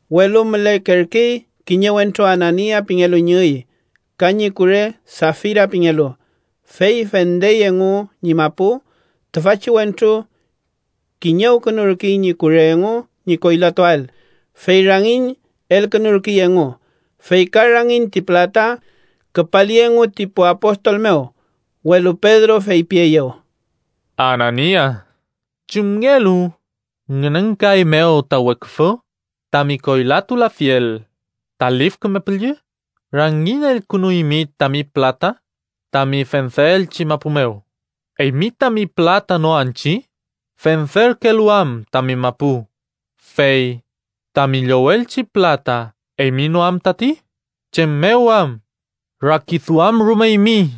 Welu mülekerkey kiñe wentru Anania pingelu ñi üy, ka ñi kure Safira pingelu, fey fendey engu ñi mapu. Tüfachi wentru kiñewkünurkey ñi kure engu ñi koylatuael, fey rangiñ elkünurkey engu, fey ka rangiñ ti pülata küpali engu ti pu apostol mew. Welu Pedro feypieyew: —Anania, ¿chumngelu ngünenkaeymew ta weküfü tami koylatulafiel ta Lif Küme Püllü? Rangiñ elkünuymi tami pülata tami fendeelchi mapu mew. ¿Eymi tami pülata no anchi? Fenderkelu am tami mapu, fey ¿tami llowelchi pülata, eymi no am tati? ¿Chem mew am rakiduamrumeymi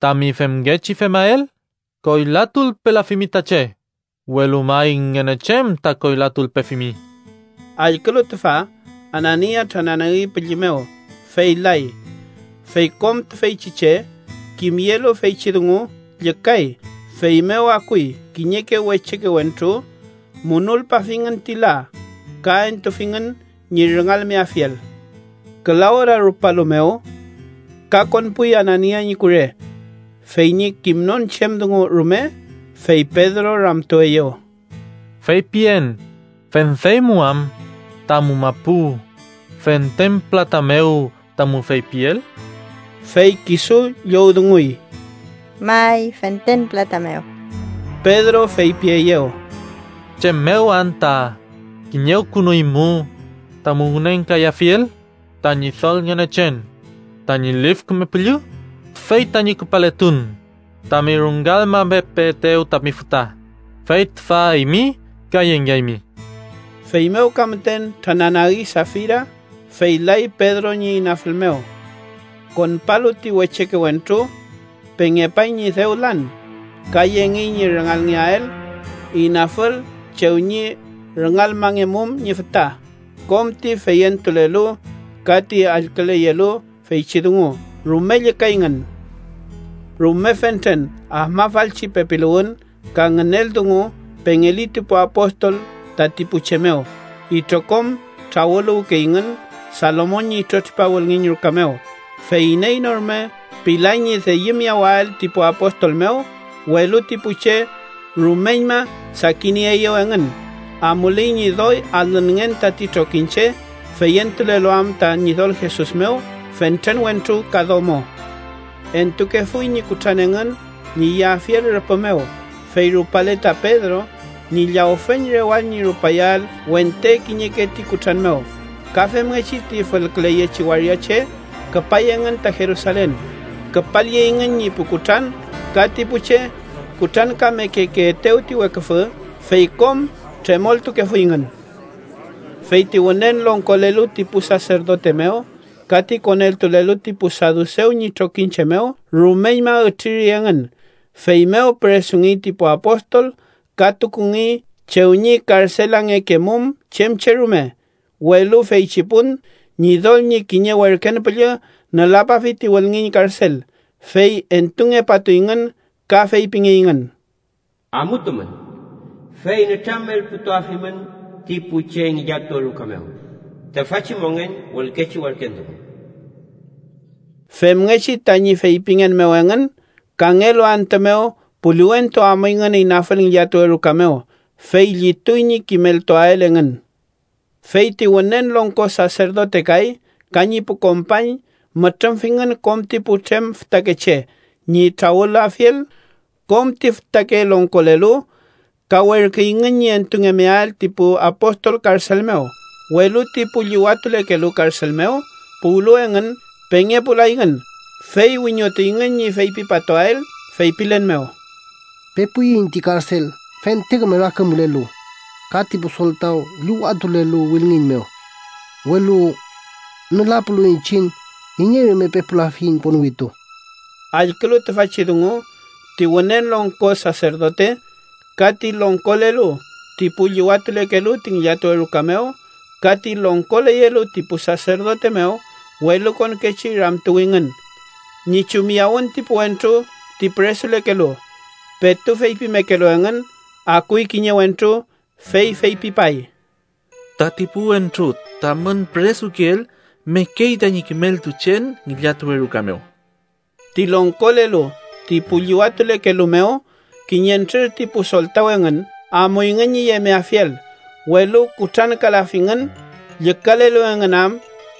tami femngechi femael? Koylatulpelafimi ta che, welu may Ngünechen ta koylatulpefimi. Allkülu tüfa, Anania trananagi pülli mew, fey lay. Fey kom tüfeychi che, kimyelu feychi dungu, llükay. Feymew akuy kiñeke wecheke wentru, munulpafingün ti la ka entufingün ñi rüngalmeafiel. Küla ora rupalu mew, ka konpuy Anania ñi kure, fey ñi kimnon chem dungu rume. Fey Pedro ramtueyew: —Feypien, ¿fendeymu am tamu mapu fenten pülata mew tamu feypiel? Fey kisu llowdunguy: —May, fenten pülata mew. Pedro feypieyew: —¿Chem mew anta kiñewkünuymu tamu ngünenkayafiel ta Ñidol Ngünechen tañi Lif Küme Püllü? Tüfey tañi küpaletun tami rüngalmamepeetew tami füta, fey tüfa eymi ka yengeaymi. Feymew ka müten trananagi Safira, fey lay Pedro ñi inafül mew. Konpalu ti wecheke wentru, pengepay ñi dew lan, ka yengey ñi rüngalngeael inafül chew ñi rüngalmangemum ñi füta. Kom ti feyentulelu, ka ti allküleyelu feychi dungu, rume llükayngün. Rume fentren afmafalchi pepiluwün ka ngünel dungu pengeli ti pu apostol tati pu che mew. Itrokom trawüluwkeyngün Salomon ñi itrotripa wülngiñ ruka mew. Fey iney no rume pilay ñi deyümiyawael ti pu apostol mew, welu ti pu che rumeñma sakinieeyew engün. Amuley ñi doy alünngen tati trokiñche, feyentulelu am ta Ñidol Jesus mew fentren wentru ka domo. Entukefuy ñi kutran engün ñi yeafiel rüpü mew, fey rupale ta Pedro, ñi llawfeñ rewall ñi rupayael wente kiñeke ti kutran mew. Ka femngechi ti fülküleyechi waria che küpay engün ta Jerusalen. Küpalyeyngün ñi pu kutran ka ti pu che kutrankamekekeetew ti weküfü. Fey kom tremoltukefuyngün. Fey ti wünen longkolelu ti pu saserdote mew ka ti koneltulelu ti pu sadusew ñi trokiñche mew, rumeñma ütriri engün. Feymew püresungey ti pu apostol ka tukungey chew ñi karselangekemum chem che rume. Welu feychi pun, Ñidol ñi kiñe werken püllü nülapafi ti wülngiñ karsel, fey entungepatuyngün ka feypingeyngün: “Amutumün, fey nütramelputuafimün ti pu che ngillatuwe ruka mew tüfachi mongen wülkechi werken dungu.” Femngechi tañi feypingen mew engün, kangelu antü mew puliwentu amuyngün inafül ngillatuwe ruka mew, fey llituy ñi kimeltuael engün. Fey ti Wünen Longko Saserdote kay ka ñi pu kompañ mütrümfingün kom ti putrem fütakeche ñi trawülafiel kom ti fütake longkolelu. Ka werküyngün ñi entumengeael ti pu apostol karsel mew. Welu ti pu llüwatulekelu karsel mew puwlu engün, pengepulayngün. Fey wiñotuyngün ñi fepipatuael, feypilen mew: —Pepuiñ ti karsel fente küme rakümkülelu ka ti pu soltaw llüwatulelu wülngiñ mew, welu nülapulu iñchiñ, iney rume pepulafiyiñ ponwitu. Allkülu tüfachi dungu, ti Wünen Longko Saserdote, ka ti longkolelu ti pu llüwatulekelu ti ngillatuwe ruka mew, ka ti longkoleyelu ti pu saserdote mew welukonkechi ramtuwingün ñi chumyawün ti pu wentru ti püresulekelu. Petu feypimekelu engün, akuy kiñe wentru, fey feypipay: —Tati pu wentru tamün püresukeel, mekey tañi kimeltuchen ngillatuwe ruka mew. Ti longkolelu ti pu llüwatulekelu mew, kiñentrür ti pu soltaw engün, amuyngün ñi yemeafiel. Welu kutrankalafingün, llükalelu engün am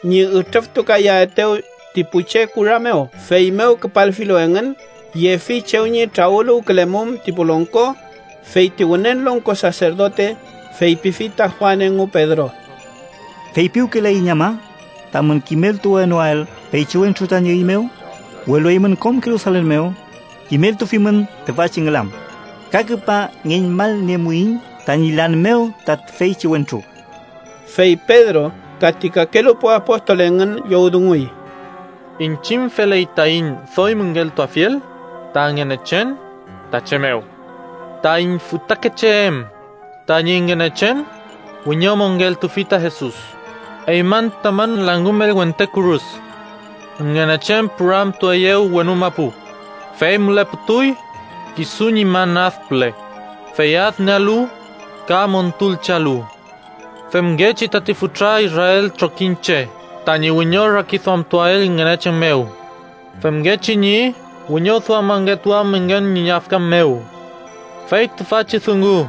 ñi ütrüftukayaetew ti pu che kura mew. Feymew küpalfilu engün, yefi chew ñi trawüluwkülemum ti pu longko, fey ti Wünen Longko Saserdote feypifi ta Juan engu Pedro: —¿Feypiwkelayiñ ama tamün kimeltuwenoael feychi wentru tañi üy mew? Welu eymün kom Jerusalen mew kimeltufimün tüfachi ngülam, ka küpa ngeñmalniemuiñ tañi lan mew ta tüfeychi wentru. Fey Pedro ka ti kakelu pu apostol engün llowdunguy: —Iñchiñ feley taiñ doy müngeltuafiel ta Ngünechen ta che mew. Taiñ fütakeche em tañi Ngünechen wiñomongeltufi ta Jesus, eymün tamün langümel wente kürus. Ngünechen püramtueyew wenu mapu, fey müleputuy kisu ñi man ad püle, fey adniealu ka montulchealu, femngechi tati fütra israel trokiñche tañi wiñorakiduamtuael Ngünechen mew femngechi ñi wiñoduamangetuam engün ñi yafkan mew. Fey tüfachi dungu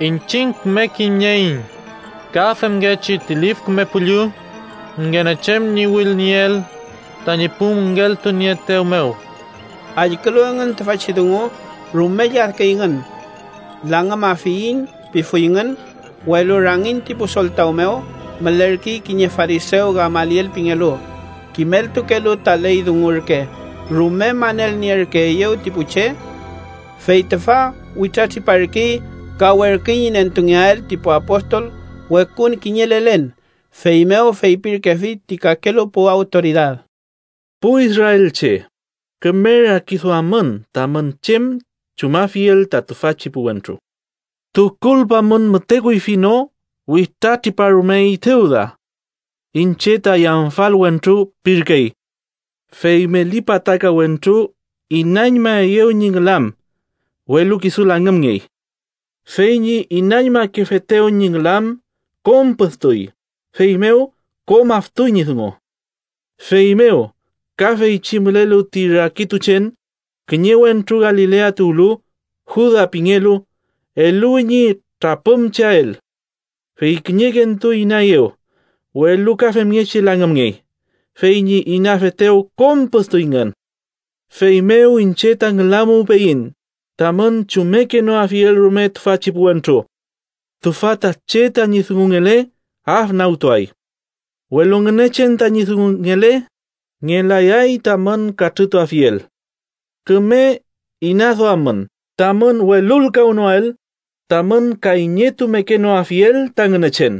iñchiñ küme kimnieiñ, ka femngechi ti Lif Küme Püllü, Ngünechen ñi wülnieel tañi pu müngeltunieetew mew. Allkülu engün tüfachi dungu, rume lladküyngün. “Langümafiyiñ” pifuyngün. Welu rangiñ ti pu soltaw mew, mülerkey kiñe farisew Gamaliel pingelu, kimeltukelu ta ley dungu ürke, rume manelnierkeeyew ti pu che. Fey tüfa witratriparkey ka werküy ñi nentungeael ti pu apostol wekun kiñe lelen. Feymew feypirkefi ti kakelu pu awtoridad: —Pu israelche, küme rakiduammün tamün chem chumafiel ta tüfachi pu wentru. Tukulpamün müte kuyfi no witratriparumey Tewda. ‘Iñche ta yamfal wentru’ pirkey, fey meli pataka wentru inañmaeyew ñi ngülam, welu kisu langümngey. Fey ñi inañmakefetew ñi ngülam, kom püdtuy, feymew kom aftuy ñi dungu. Feymew ka, feychi mülelu ti rakituchen, kiñe wentru Galilea tuwlu, Juda pingelu, eluwi ñi trapümcheael. Fey kiñekentu inaeyew, welu ka femngechi langümngey, fey ñi inafetew kom püdtuyngün. Feymew iñche ta ngülamuwpeyiñ tamün chummekenoafiel rume tüfachi pu wentru. Tüfa ta che tañi dungungele, afnagtuay. Welu Ngünechen tañi dungungele, ngelayay tamün katrütuafiel. Küme inaduammün tamün welulkawnoael, tamün kayñetumekenoafiel ta Ngünechen.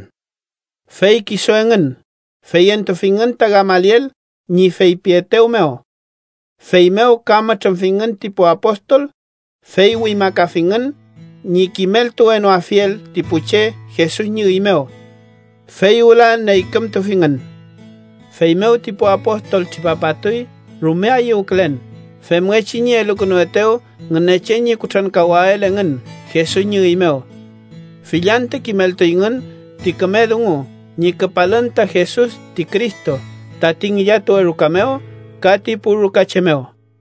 Fey kisu engün feyentufingün ta Gamaliel ñi feypietew mew. Feymew ka mütrümfingün ti pu apostol, fey wimakafingün ñi kimeltulwenoafiel ti pu che Jesus ñi üy mew. Fey wüla neykümtufingün. Feymew ti pu apostol tripapatuy rume ayüwkülen femngechi ñi elukünuetew Ngünechen ñi kutrankawael engün Jesus ñi üy mew. Fill antü kimeltuyngün ti küme dungu ñi küpalün ta Jesus ti Cristo, tati ngillatuwe ruka mew ka ti pu rukache mew.